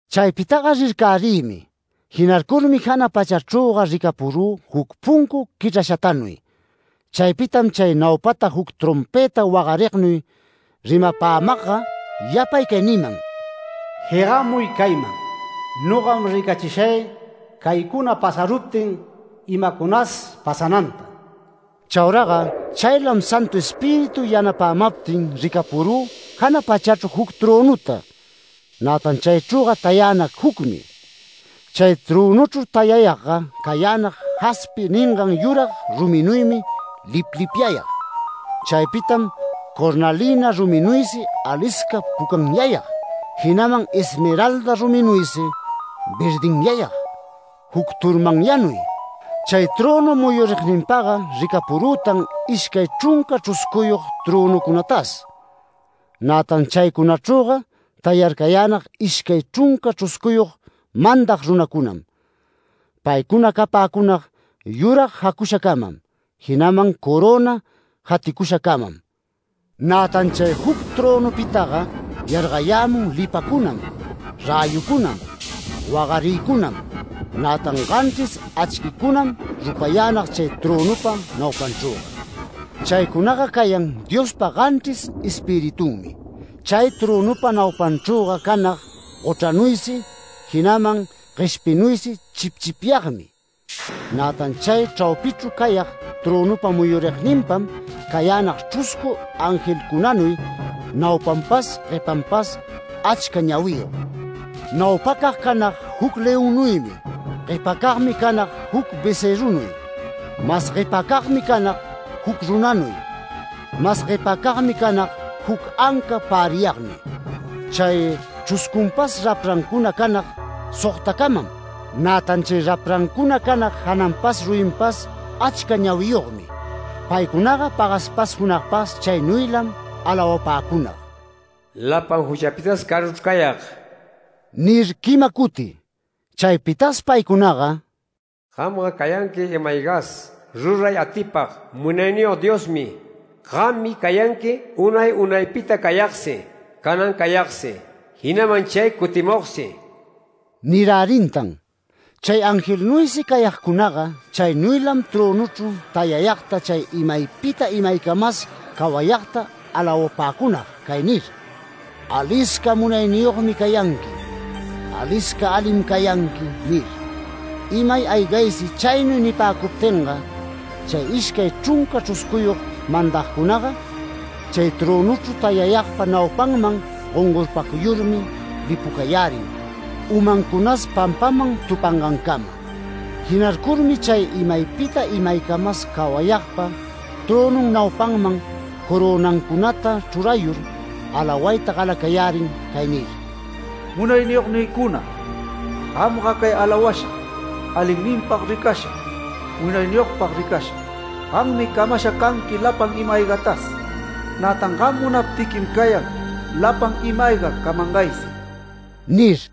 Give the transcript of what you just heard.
Chaypitaga rircärïmi, jinarcurmi jana pachachrüga ricapurü juc puncu quichrashatanuy. Chaypitam chay naupata juc trompëta wagarignuy rimapämagga yapay cay niman: “Jegamuy cayman. Nogam ricachishay caycuna pasaruptin imacunas pasananta”. Chauraga chaylam Santu Espíritu yanapämaptin ricacarü jana pachachru juc trönuta, nätan chaychrüga tayänag jucmi. Chay trönuchru tayayagga cayänag jaspi ningan yurag ruminuymi liplipyayag. Chaypitam cornalina ruminuysi alisca pucanyayag, jinaman esmeralda ruminuysi verdinyayag, juc turmanyanuy. Chay trönu muyurigninpaga ricapurütan ishcay chrunca chruscuyog trönucunatas. Nätan chaycunachrüga tayarcayänag ishcay chrunca chruscuyog mandag runacunam. Paycuna capäcunag yurag jacushacamam, jinaman coröna jaticushacamam. Nätan chay juc trönupitaga yargayämun lipacunam, räyucunam, wagariycunam. Nätan ganchris achquicunam rupayänag chay trönupa naupanchrüga. Chaycunaga cayan Diospa ganchris Espiritunmi. Chay trönupa naupanchrüga canag gochranuysi, jinaman gueshpinuysi chipchipyagmi. Nätan chay chraupichru cayag trönupa muyurigninpam cayänag chruscu angelcunanuy naupanpas, guepanpas achca ñawiyog. Naupacag canag juc leonnuymi. Guepacagmi canag juc becërrunuy. Mas guepacagmi canag juc runanuy. Mas guepacagmi canag juc anca päriyagnuy. Chay chruscunpas raprancuna canag sogtacamam, nätan chay raprancuna canag jananpas ruyinpas achca ñawiyogmi. Paycunaga pagaspas junagpas chaynuylam alawapäcunag “¡Lapan juchapitas caruchru cayag!” nir quima cuti. Chaypitas paycunaga “Gamga cayanqui ima-aygas ruray atipag Munayniyog Diosmi. Gammi cayanqui unay unaypita cayagsi, canan cayagsi, jinaman chay cutimugsi” nirärintan. Chay angelnuysi cayagcunaga, chaynuylam trönuchru tayayagta chay imaypita imaycamas cawayagta alawapäcunag cay nir: “Alisca munayniyogmi cayanqui, alisca alim cayanqui” nir. Imay aygaysi chaynuy nipäcuptinga, chay ishcay chrunca chruscuyog mandagcunaga, chay trönuchru tayayagpa naupanman gongorpacuyurmi lipucayärin umancunas pampaman tupangancama. Jinarcurmi chay imaypita imaycamas cawayagpa trönun naupanman corönancunata chrurayur alawayta galacayärin cay nir: “Munayniyognïcuna, gamga cay alawasha, alinninpag ricasha, munayniyogpag ricasha. Gammi camasha canqui lapan ima-aygatas. Nätan gam munaptiquim cayan lapan ima-ayga camangaysi” nir.